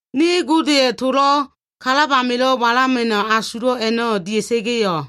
Ne Godeya꞉ towo꞉ kalab amilo꞉ walama꞉no꞉ asulo꞉ a꞉no꞉ dia꞉sa꞉ga꞉yo꞉,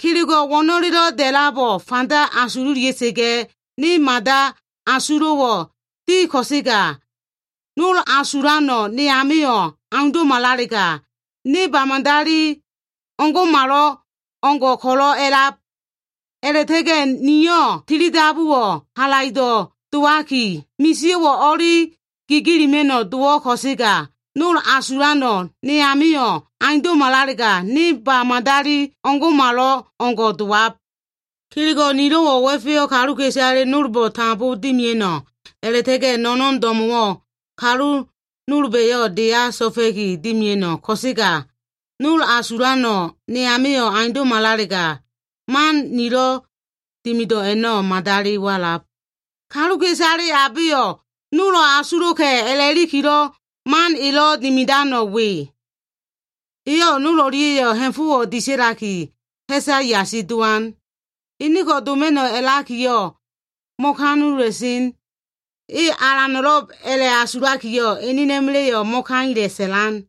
kelego꞉ wo꞉no꞉lelo꞉ da꞉labo꞉ fanda asululia꞉sa꞉ga꞉, ne mada asulo꞉wo꞉ di ko꞉sega, nol asulano꞉ ne amio꞉ aundo꞉malalega, ne ba madali o꞉ngo꞉malo꞉ngo꞉ ko꞉lo꞉ a꞉lab. A꞉la꞉ta꞉ga꞉ niyo꞉ tili dabuwo꞉ halaido꞉ dowaki, misio꞉wo꞉ o꞉li gigilima꞉no꞉ dowo꞉, ko꞉sega nol asulano꞉ ne amio꞉ aundo꞉malalega, ne ba madali o꞉ngo꞉malo꞉ngo꞉ dowab. Kelego꞉ nilo꞉wo꞉ wa꞉feyo꞉ kaluka꞉isale nolbo꞉ tambo dimia꞉no꞉ a꞉la꞉ta꞉ga꞉ no꞉no꞉n do꞉mo꞉wo꞉ kalu nolba꞉yo꞉ deya so꞉fa꞉ki dimia꞉no꞉ ko꞉sega, nol asulano꞉ ne amio꞉ aundo꞉malalega, man nilo꞉ dimido꞉ a꞉no꞉ madali walab. Kaluka꞉isale abeyo꞉ nolo꞉ asulo꞉ka꞉ a꞉la꞉likilo꞉ man elo꞉ dimidano꞉ we. Eyo꞉ nol o꞉lia꞉yo꞉ ha꞉fo꞉wo꞉ disa꞉laki, ha꞉sa yasi dowan. E nol o꞉lia꞉yo꞉ mo꞉etea꞉sen. E alano꞉lo꞉b a꞉la꞉asulakiyo꞉, enena꞉ma꞉la꞉yo꞉ mo꞉kaila꞉ sa꞉lan.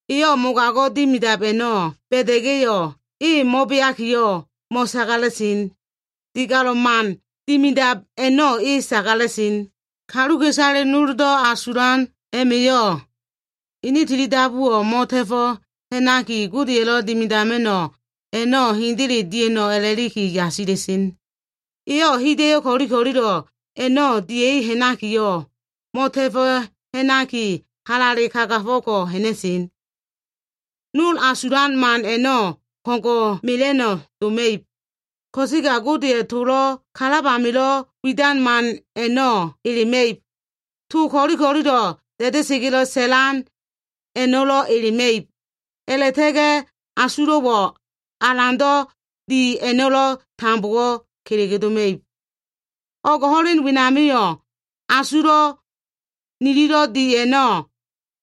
Eyo꞉ mogago꞉ dimidab a꞉no꞉ ba꞉da꞉ga꞉yo꞉, e mo꞉beakiyo꞉ mo꞉sagala꞉sen. Digalo꞉ man dimidab a꞉no꞉ e sagala꞉sen. Kaluka꞉isale noldo꞉ asulan a꞉ma꞉yo꞉ ene tili dabuwo꞉ mo꞉ta꞉fo꞉ ha꞉naki, Godeya꞉lo꞉ dimidama꞉no꞉ a꞉no꞉ hendele dia꞉no꞉ a꞉la꞉liki yasila꞉sen. Eyo꞉ hida꞉yo꞉ ko꞉li ko꞉lilo꞉ a꞉no꞉ dia꞉i ha꞉nakiyo꞉, mo꞉ta꞉fo꞉ ha꞉naki, halale kagafo꞉ ko꞉ ha꞉na꞉sen. Nol asulan man a꞉no꞉ ko꞉ngo꞉ mela꞉no꞉ doma꞉ib. Ko꞉sega Godeya꞉ towo꞉ kalab amilo꞉ widan man a꞉no꞉ elema꞉ib. To ko꞉li ko꞉lilo꞉ da꞉da꞉sa꞉ga꞉lo꞉ sa꞉lan a꞉no꞉lo꞉ elema꞉ib. A꞉la꞉ta꞉ga꞉ asulo꞉wo꞉ alando꞉ di a꞉no꞉lo꞉ tambowo꞉ kelege doma꞉ib. O꞉g ho꞉len wenamio꞉, asulo꞉ nililo꞉ di a꞉no꞉,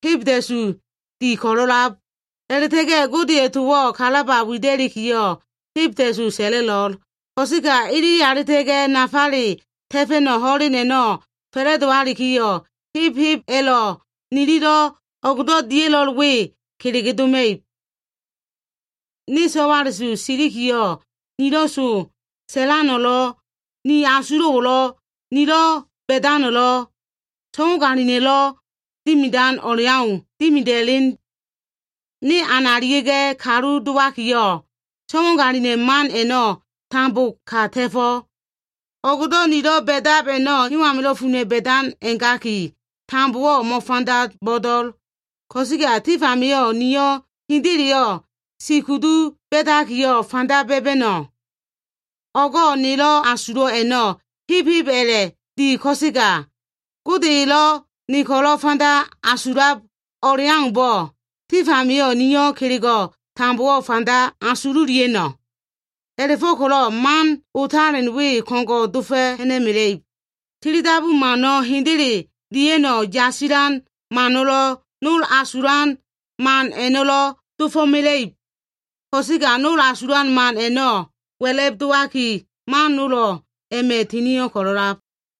hebda꞉su di ko꞉lo꞉lab. A꞉la꞉ta꞉ga꞉ Godeya꞉ towo꞉ kalaba wida꞉likiyo꞉, hebda꞉su sa꞉la꞉lo꞉l. Ko꞉sega ilili alita꞉ga꞉ nafale ta꞉fa꞉no꞉ ho꞉len a꞉no꞉ fa꞉la꞉dowalikiyo꞉, heb heb a꞉lo꞉ nililo꞉ o꞉gdo꞉ dia꞉lo꞉l we kelege doma꞉ib. Ne so꞉wala꞉su silikiyo꞉, nilo꞉ to sa꞉lano꞉lo꞉, ni asulo꞉wo꞉lo꞉, nilo꞉ ba꞉dano꞉lo꞉, so꞉wagalina꞉lo꞉ dimidan o꞉leau dimida꞉len. Ne analia꞉ga꞉ kalu dowakiyo꞉, so꞉wagalina꞉ man a꞉no꞉ tambo ka ta꞉fo꞉. O꞉gdo꞉ nilo꞉ ba꞉dab a꞉no꞉, hewo꞉ amilo꞉ funa꞉ ba꞉dan a꞉gaki, tambowo꞉ mo꞉fanda bo꞉do꞉l. Ko꞉sega tif amio꞉ nio꞉ hendeleyo꞉ si kudu ba꞉dakiya, fanda ba꞉ba꞉no꞉. O꞉go꞉ nelo꞉ asulo꞉ a꞉no꞉, heb heb a꞉la꞉ di ko꞉sega, Gode elo꞉ ne ko꞉lo꞉ fanda asululiab o꞉leaumbo꞉, tif amio꞉ niyo꞉ kelego꞉ tambowo꞉ fanda asululia꞉no꞉. A꞉la꞉fo꞉ko꞉lo꞉ man otalen we ko꞉ngo꞉ dofo꞉ ha꞉na꞉mela꞉ib. Tili dabu mano꞉, hendele dia꞉no꞉ yasilan mano꞉lo꞉, nol asulan man a꞉no꞉lo꞉ dofo꞉mela꞉ib. Ko꞉sega nol asulan man a꞉no꞉ wa꞉la꞉b dowaki, man nolo꞉ a꞉ma꞉ tinio꞉ ko꞉lo꞉lab.